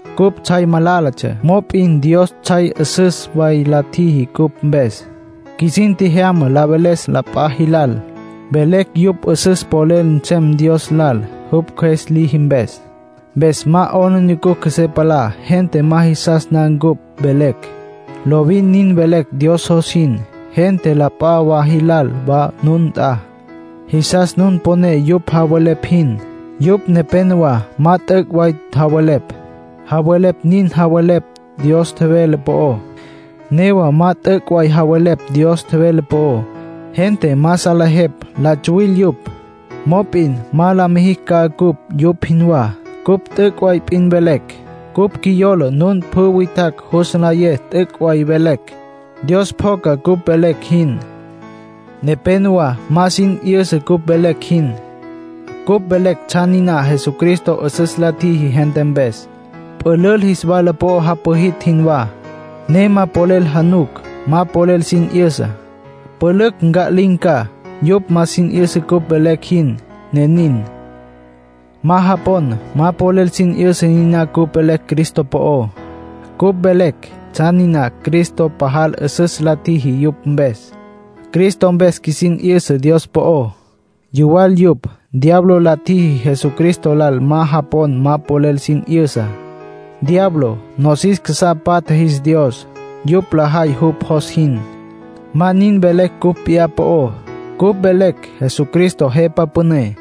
Cupj tsjay malálatsja, mop'in Dios tsjay 'üsüs way la tjiji cupj mpes. Qjuisin tjejyama la veles la p'a jilal, velecj yupj 'üsüs polel nsem Dios lal, jupj Cjües liji mpes. Mpes ma 'aplijila qjuesé palá gente ma jisas na cupj velecj. Lovin nin velecj Dios jos jin. Gente la p'a wa jil wa nun nt'a, jisas nun poné yupj javelepj jin. Yupj nepénowa ma t'üc' way javelepj. Javelepj nin javelepj Dios tjevele po'ó, newa ma t'üc' way javelepj Dios tjevele po'ó. Gente ma salejepj la tsuwil yupj. Mop'in ma la mijicj ca cupj yupj jinwá. Cupj t'üc' way p'in velecj. Cupj qjuiyola nun pjü witjacj jus nlayé t'üc' way velecj. Dios pjoca cupj velecj jin. Nepénowa ma sin 'yüsa cupj velecj jin. Cupj velecj tsjan niná Jesucristo 'üsüs la tjiji gente mpes. Pülül jis wala po'o japwijitj jinwá, ne ma polel januc, ma polel sin 'yüsa. Pülücj nca'lin̈ ca; yupj ma sin 'yüsa cupj velecj jin, ne nin. Ma japon, ma polel sin 'yüsa niná cupj velecj Cristo po'ó. Cupj velecj tsjan niná Cristo pajal 'üsüs la tjiji yupj mpes. Cristo mpes qjuisin 'yüsa Dios po'ó. Yuwal yupj. Diablo la tjiji Jesucristo lal ma japon ma polel sin 'yüsa. Diablo nosis casá patja jis dios, yupj lajay jupj jos jin. Ma nin velecj cupj p'iyá po'ó. Cupj velecj Jesucristo Jepa Püné.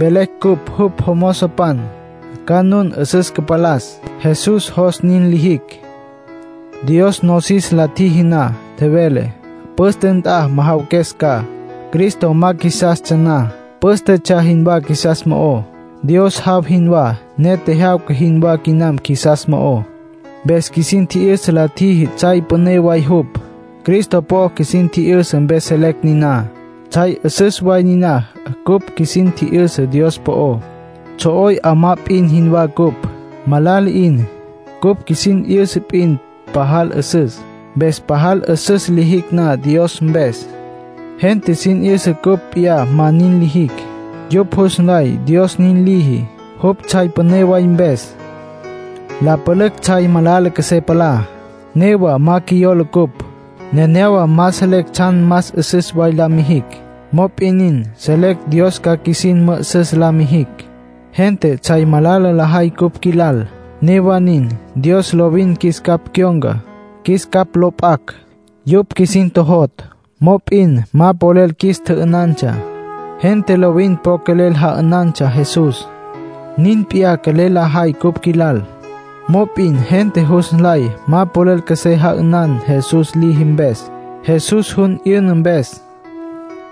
Velecj cupj jupj jomozopan, ca nun 'üsüs cüpalas. Jesús jos nin lijicj. Dios nosis la tjiji na, tjevele: “Püste nt'a majawaques ca”. Cristo ma qjuisastsja na, pǘstetsja jinwá qjuisas mo'ó. Dios jaw jinwá, ne tjejyawca jinwá quinam qjuisas mo'ó. Mpes qjuisin tji'yüsa la tjiji tsjay püné way jupj. Cristo po'o qjuisin tji'yüsa mpes selecj niná. Tsjay 'üsüs way niná cupj qjuisin tji'yüsa Dios po'ó. Tsjo'oy 'amá p'in jinwá cupj, malala 'in. Cupj qjuisin 'yüsa p'in pajal 'üsüs. Mpes pajal 'üsüs lijicj na Dios mpes, gente sin 'yüsa cupj p'iyá ma nin lijicj. Yupj jus nlay Dios nin liji, jupj tsjay püné way mpes. La pülücj tsjay malala qjuesé palá. Newa ma qjuiyola cupj. Nenéyawa ma selecj tsjan más 'üsüs way la mijicj. Mop'in nin, selecj Dios ca qjuisin mü'üsüs la mijicj. Gente tsjay malala lajay cupj qjuilal. Newa nin, Dios lovin qjuis capj cyon̈ca, qjuis capj lo p'acj. Yupj qjuisin tjojotj. Mop'in ma polel qjuis tjü'ünantsja. Gente lovin po quelel ja'ünantsja Jesús. Nin p'iyá quelel lajay cupj qjuilal. Mop'in gente jus nlay ma polel qjuesé ja'ünan Jesús liji mpes, Jesús jun 'yüna mpes.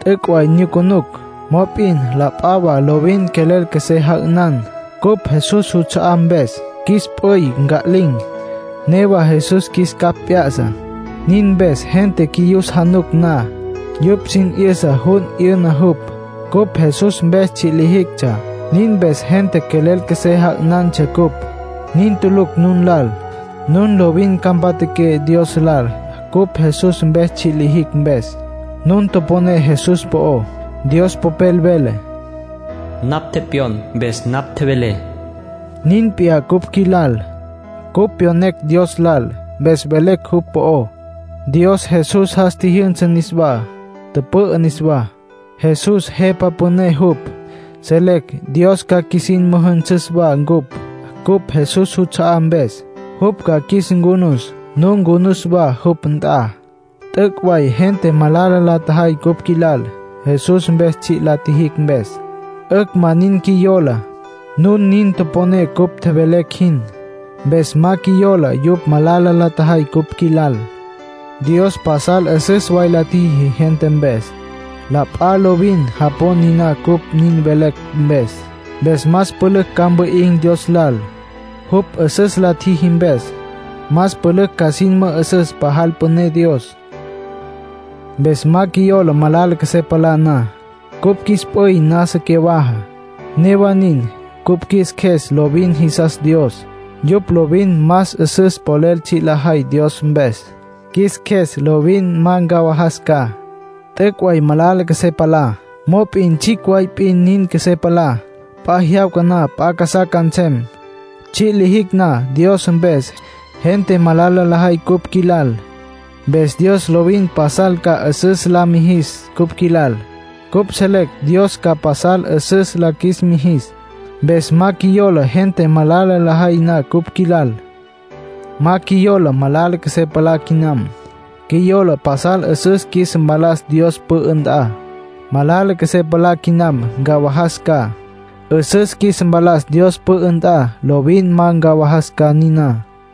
T'üc' way nyucunucj, mop'in la p'a wa lovin quelel qjuesé ja'ünan, cupj Jesús juts'a'á mpes. Qjuis p'üy nca'lin̈, newa Jesús qjuis capj p'ya'sa; nin mpes gente qjuiyus januc na, yupj sin 'yüsa jun 'yüna jupj. Cupj Jesús mpes tsji' lijictsja, nin mpes gente quelel qjuesé ja'ünantsja cupj. Nin tulucj nun lal; nun lovin ca mpatjaqué Dios lal cupj Jesús mpes tsji' la tjijicj mpes. Nun toponé Jesús po'ó. Dios Popel vele: “Napj tepyon, mpes napj tjevelé”. Nin p'iyá cupj qjuis lal. Cupj pyonecj Dios lal, mpes velecj jupj po'ó. Dios Jesús jas tjijyünsa niswá, tüpü'ü niswá; Jesús Jepa Püné jupj. Selecj Dios ca qjuisin müjünsüs wa ncupj, cupj Jesús juts'a'á mpes. Jupj ca qjuis ncunus, nu ncunus wa, jupj nt'a. T'üc' way gente malala la tjajay cupj qjuilal, Jesús mpes tsji' la tjijicj mpes. 'Ücj; ma nin qjuiyola. Nun nin toponé cupj tjevelecj jin. Mpes ma qjuiyola yupj malala la tjajay cupj qjuilal. Dios pasal 'üsüs way la tjiji gente mpes. La p'a lovin japon niná cupj nin velecj mpes. Mpes más pülücj ca mwi'in̈ Dios lal, jupj 'üsüs la tjiji mpes. Más pülücj ca sin mü'üsüs pajal püné Dios. Mpes ma qjuiyola malala qjuesé palá na. Cupj qjuis p'üy nasa cyawaja. Newa nin, cupj qjuis qjues lovin jisas Dios. Yupj lovin más 'üsüs polel tsji' lajay Dios mpes. Qjuis qjues lovin ma ncawajas ca. T'üc' way malala qjuesé palá. Mop'in tsjicj way p'in nin qjuesé palá; p'a jyawca na p'a casá ca nsem. Tsji' lijicj na Dios mpes, gente malala lajay cupj qjuilal. Mpes Dios lovin pasal ca 'üsüs la mijis cupj qjuilal. Cupj selecj Dios ca pasal 'üsüs la qjuis mijis, mpes ma qjuiyola gente malala lajay na cupj qjuilal. Ma qjuiyola malala qjuesé palá quinam. Qjuiyola pasal 'üsüs qjuis mpalas Dios pü'ü nt'a. Malala qjuesé palá quinam, ncawajas ca. 'Üsüs qjuis mpalas Dios pü'ü nt'a, lovin ma ncawajas ca niná.